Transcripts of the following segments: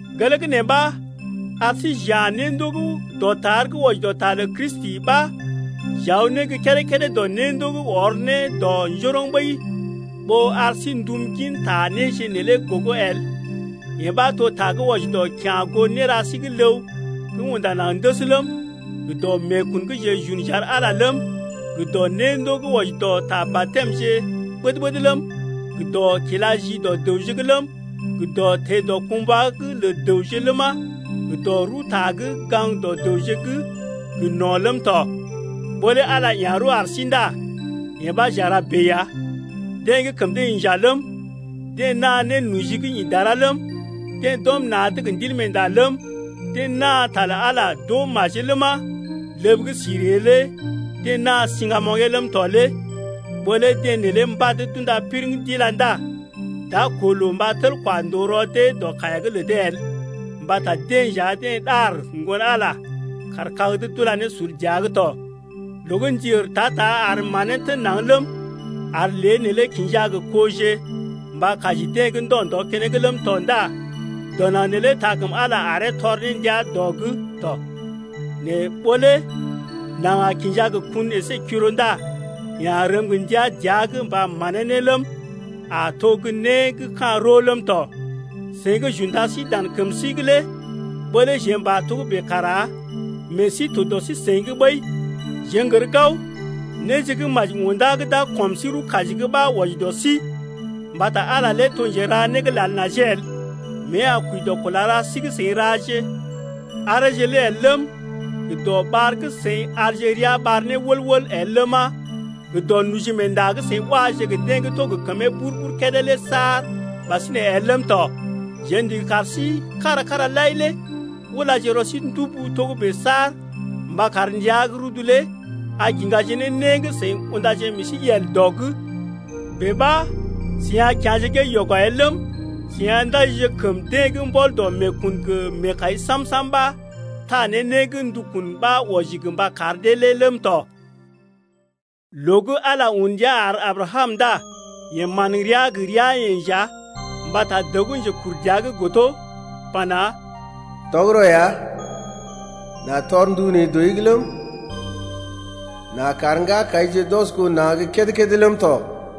Gelee gə́ nee ɓa ar sí j’ya̰ néndoo gə́ dɔtar gə́ wɔji dɔ ta lə Kristi ɓa j’aw ne gə́ kédé-kédé dɔ néndoo gə́ ɔr ne dɔ njoroŋ ɓəi ɓó ar sí n’tum gin ta néje neelé gogo el: yee ɓa to ta gə́ wɔji dɔ kya̰ goo néra sí gə́ ləw gə́ unda naŋg ndəs ləm, gə dɔ meekun gə́ jeḛ j’un j’ar Ala ləm, gə dɔ néndoo gə́ wɔji dɔ ta baptɛməje ɓəd-ɓəd ləm, gə dɔ kila ji dɔ dəwje’g ləm, gə dɔ teḛ dɔkumbwa’g lə dəwje ləma, gə dɔ rəwta gə́ gaŋg dɔ dəwje’g gə no̰ ləm tɔ. Ɓó lé Ala ya̰ rəw ar sí ndá yee ɓa j’a ra bèe ya. Deḛ gə́ kəm dee inja ləm, deḛ naa nénoji gə́ ḭ dara ləm, deḛ d’ɔm na̰’d gə Ndilmeenda ləm, deḛ naa ta lə Ala d’oo majee ləma, ləb gə́ si ree lé deḛ naa siŋgamoŋgee ləm tɔ lé ɓó lé deḛ neelé mbad d’unda piriŋ d’ila ndá d’a koo loo mba tel kwa ndòo rɔ dee dɔ kaiya’g lə dee el mbata deḛ nja deḛ ɗar Ŋgon-Ala kaar kag’d d’ula ne sul dəa’g tɔ. Loo gə́ ndi ər ta-ta ar manee tən naŋg ləm, ar lée neelé kinja gə koje mba kaji dee gə ndɔ-ndɔ keneŋ ləm tɔ ndá dɔ naŋg neelé taa kəm Ala aree tɔr ne ndia dɔ’g tɔ. Nɛ ɓó lé naŋg a kinja gə kun əsé kiro ndá yeḛ a rəm gə ndia dəa’g mba manee ne ləm, a to gə́ né gə́ ka̰ roo ləm tɔ. Seḭ gə́ j’unda sí dan kəm sí’g lé ɓó lé jeḛ m’pa togə́bè kara meḛ sí to dɔ sí-seḭ’g ɓəi, jeḛ n’gər gao, néje gə́ maji unda gə́ d’a kɔm sí rəw-kaji’g ɓa wɔji dɔ sí. Mbata Ala lé to njera né gə́ lal najee el, mée a kwəi dɔ kula ra sí gə́ seḭ raje areeje lé el ləm, gə dɔ ɓar gə́ seḭ arje ria ɓar ne wəl-wəl el ləma, gə dɔ nojimeenda gə́ seḭ waje gə deḛ gə́ to gə kəmee bur-bur kédé lé saar ɓasinè el ləm tɔ. Jeḛ ndigi kar sí-seḭ kára-kára lai lé ulaje rɔ sí ndubu togə́bè saar mba kar ndəa gə́ rudu lé a kiŋgaje ne né gə́ seḭ undaje meḛ sí yel dɔ’g. Bèe ɓa seḭ a kya̰je gée yɔgɔ el ləm, seḭ a ndajije kəm deḛ gə́ mbɔl dɔ meekun gə meekai sam-sam ɓa taa ne né gə́ ndukun ɓa wɔji gə mba kar dee lé ləm tɔ. Loo gə́ Ala un ndia ar Abrakam ndá yeḛ man rəa gə ria-yeḛ nja mbata dəw gə́ njekur dəa’g godo pana: Tɔgərɔ ya, n’a tɔr ndu neḛ dɔi’g ləm, n’a kar ŋgakaije d’ɔs goo na̰ gə́ kédé-kédé ləm tɔ.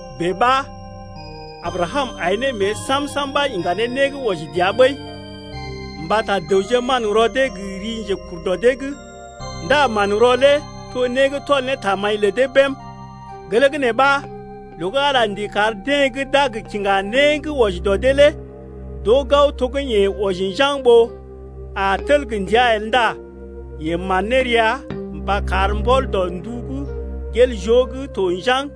Bèe ɓa Abrakam ai ne mée sam-sam ɓa iŋga ne né gə́ wɔji dəa ɓəi. Mbata dəwje manrɔ dee gə ri njekur dɔ dee’g ndá manrɔ lé to né gə́ tɔl ne tamaḭ lə dee bém. Gelee gə́ nee ɓa loo gə́ Ala ndigi kar deḛ gə́ d’a gə kiŋga né gə́ wɔji dɔ dee lé d’oo gao to gə́ yeḛ wɔji njaŋg ɓó a tel gə ndia el ndá yeḛ man ne rəa mba kar mbɔl dɔ ndu gə́ gel joo gə́ to njaŋg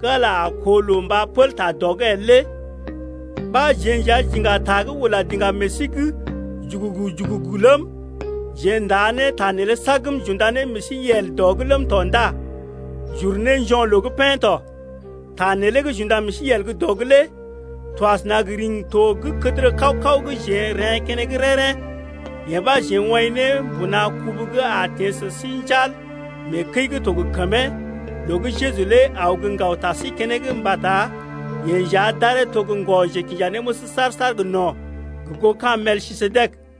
gə́ Ala a koo loo mba pəl ta dɔ’g el lé ɓa jeḛ nja j’iŋga ta gə́ ula diŋgam meḛ sí’g jugugu-jugugu ləm, jeḛ n’taa ta neelé sagm j’unda ne meḛ sí yel dɔ’g ləm tɔ ndá j’uru ne njo̰loo’g pḛ́ tɔ. Ta neelé gə́ j’unda meḛ sí yel gə́ dɔ’g lé to asəna gə riŋgi-to gə́ kədərə kaw-kaw gə́ jeḛ n’reḛ́ keneŋ rḛ́-rḛ́, yee ɓa jeḛ woḭ ne mbuna kubu gə́ a teḛ sə sí njal mee kəi gə́ to gə kəmee’g loo gə́ Jeju lé aw gə́ ŋgaw ta sí keneŋ mbata yeḛ nja d’aree to gə́ ŋgɔ-njekinjanéməs saar-saar gə́ no̰, gə goo ka̰ Melkisedek ya.